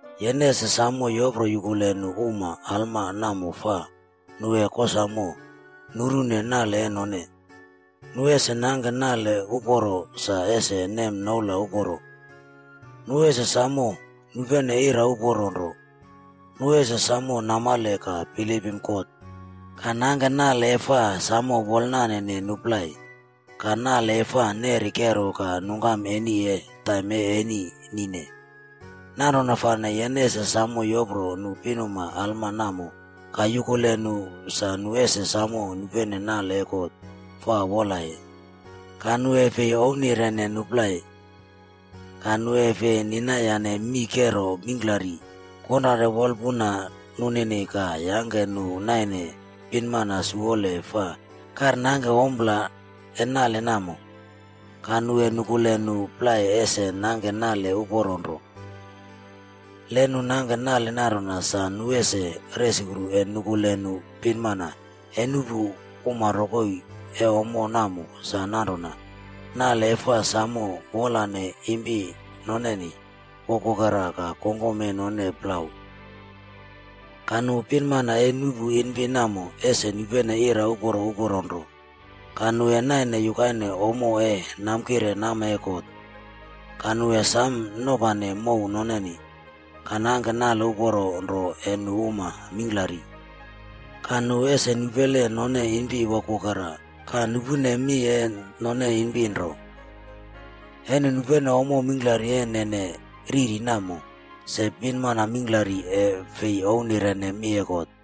Yene ese samo yoproyukule nu uma alma namo fa nu e kosamo nurune nale e none. Nu ese nangke nale uporo sa ese nem noula uporo. Nu ese samo nupene ira uporo nro. Nu ese samo namale ka bilipim God, ka nangke nale e fa samo wolnanene nu plai, ka nale e fa neri kero ka nungkam eni e taim e eni nine. Nanrona fane, yene ese samo yopro nu pinmana alma namo ka yukule nu sa nu ese samo nupene nale e God fa wolaye. Ka nu e fi ouwnirene nu plai. Ka nu e fi ninayane mii kero mingklari konrare wolpuna noneni ka yangke nu naine pinmana siwole fa karnangke ompla e nale namo. Ka nu e nukule nu plai ese nangke nale uporo nro. Le nu nangke nale nanrona, sa nu ese resukru e nukule nu pinmana e nuꞌpu uma rokoi e ommo namo sa nanrona, nale e fa samo wolane impi noneni wokwokera ka kongkom e none plau. Ka nu pinmana e nuꞌpu impi namo ese nupene ira uporo uporo nro, ka nu e naine yukaine ommo e namkire nama e God. Ka nu e sam nopane mow noneni, ka nangke nale uporo nro e nu uma mingklari. Ka nu ese nupele none impi wokwokera ka nupune mi e none impi nro. E nu nupene ommo mingklari e nene riri namo, se pinuma mingklari e fi ouwnirene mi e God.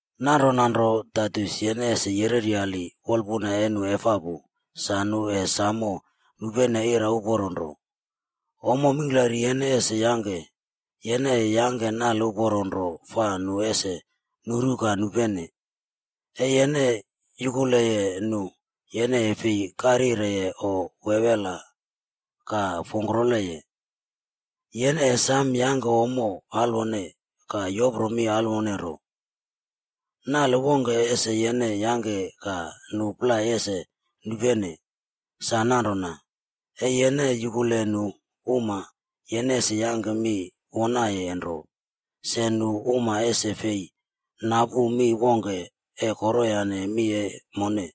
Nanrona nro, Taitus yene ese yereryali wolpuna e nu efapu sa nu e samo nupene ira uporo nro. Ommo mingklari yene ese yangke, yene e yangke nale uporo nro fa nu ese nuru ka nupene. E yene yukuleye nu, yene e fi karyireye o wewela ka fongkroleye. Yene e sam yangke ommo alwone ka yopro mi alwone nro. Nale wongke ese yene yangke ka nu plai ese nupene, sa nanrona, e yene yukule nu uma, yene ese yangke mi wonaye nro se nu uma ese fi napu mi wongke e koroyane mi e mone.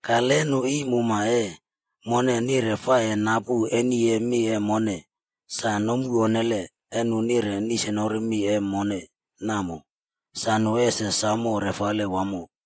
Ka le nu iim uma e mone nire fa e napu eni e mi e mone, sa nomu onnele e nu nire nisnori mi e mone namo, sa nu ese samo refale wamo.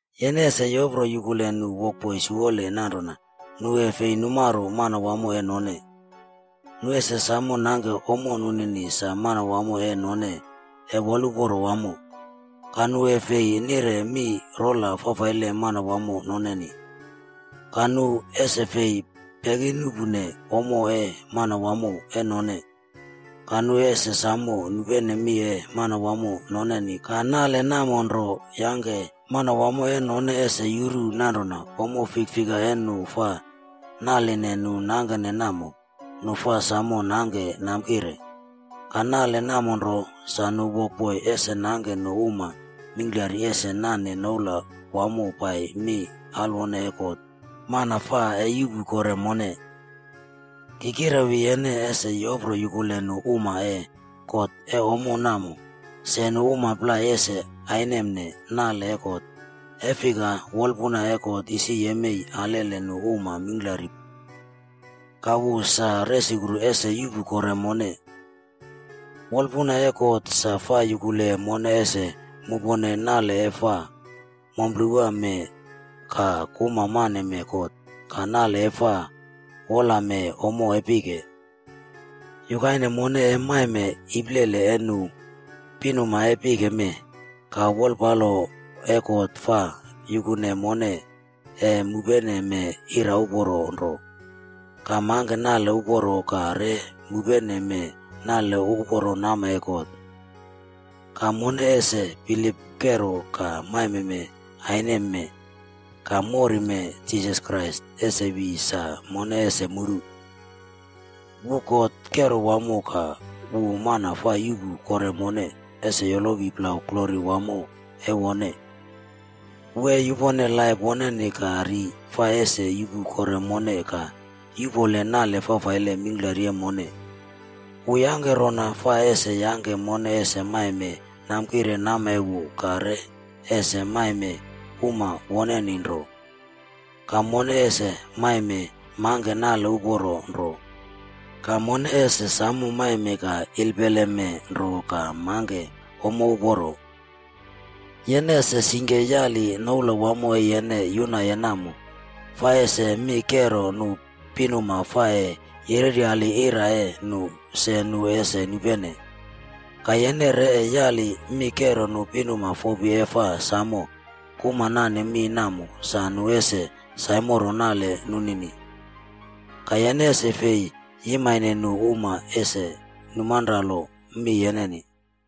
Yene ese yopro yukule nu wokboi siwole nanrona nu e fi numaro manawamo e none. Nu ese samo nangke ommo nunini sa manawamo e none e woluporo wamo. Ka nu e fi nire mi rola fafaile manawamo noneni. Ka nu ese fi pekinuꞌpune ommo e manawamo e none. Ka nu ese samo nupene mi e manawamo noneni ka nale namo nro yangke manawamo e none ese yuru nanrona ommo fikfika e nu fa naline nu nangkene namo, nu fa samo nangke namkire. Ka nale namo nro, sa nu wokboi ese nangke nu uma mingklari ese nane noula wamo pai mi alwone e God, mana fa e yuꞌpu kore mone. Ki kirewi yene ese yopro yukule nu uma e God e ommo namo se nu uma plai ese ainemne nale e God, e fika wolpuna e God isi yemei alele nu uma mingklari pu. Ka wu sa resukru ese yuꞌpu kore mone. Wolpuna e God sa fa yukule mone ese mupone nale e fa momplewame ka kuma maneme God ka nale e fa wolame ommo e pike. Yukaine mone e maime iplele e nu pinuma e pike mee, ka wolpalo e God fa yukune mone e mupeneme ira uporo nro, ka mangke nale uporo ka re mupeneme nale uporo nama e God. Ka mone ese bilip kero ka maime aimeme ka morime Jisas Krais ese wi sa mone ese muru. Wu God kero wamo ka wu mana fa yuꞌpu kore mone ese yolowi plau glori wamo e wone. Wu e yupone laip woneni ka ri fa ese yuꞌpu kore mone ka yuꞌpole nale fafaile mingklari e mone. Wu yangke rona fa ese yangke mone ese maime namkire nama e wu ka re ese maime uma woneni nro. Ka mone ese maime mangke nale uporo nro. Ka mone ese samo maime ka ilpeleme nro ka mangke ommo uporo. Yene ese singke yali noula wamo e yene yunaye namo fa ese mi kero nu pinuma fa e yereryali ira e nu se nu ese nupene. Ka yene re e yali mi kero nu pinuma fopi e fa samo kuma nane mi namo sa nu ese saimoro nale nunini. Ka yene ese fi yimaine nu uma ese numanralo mi yeneni.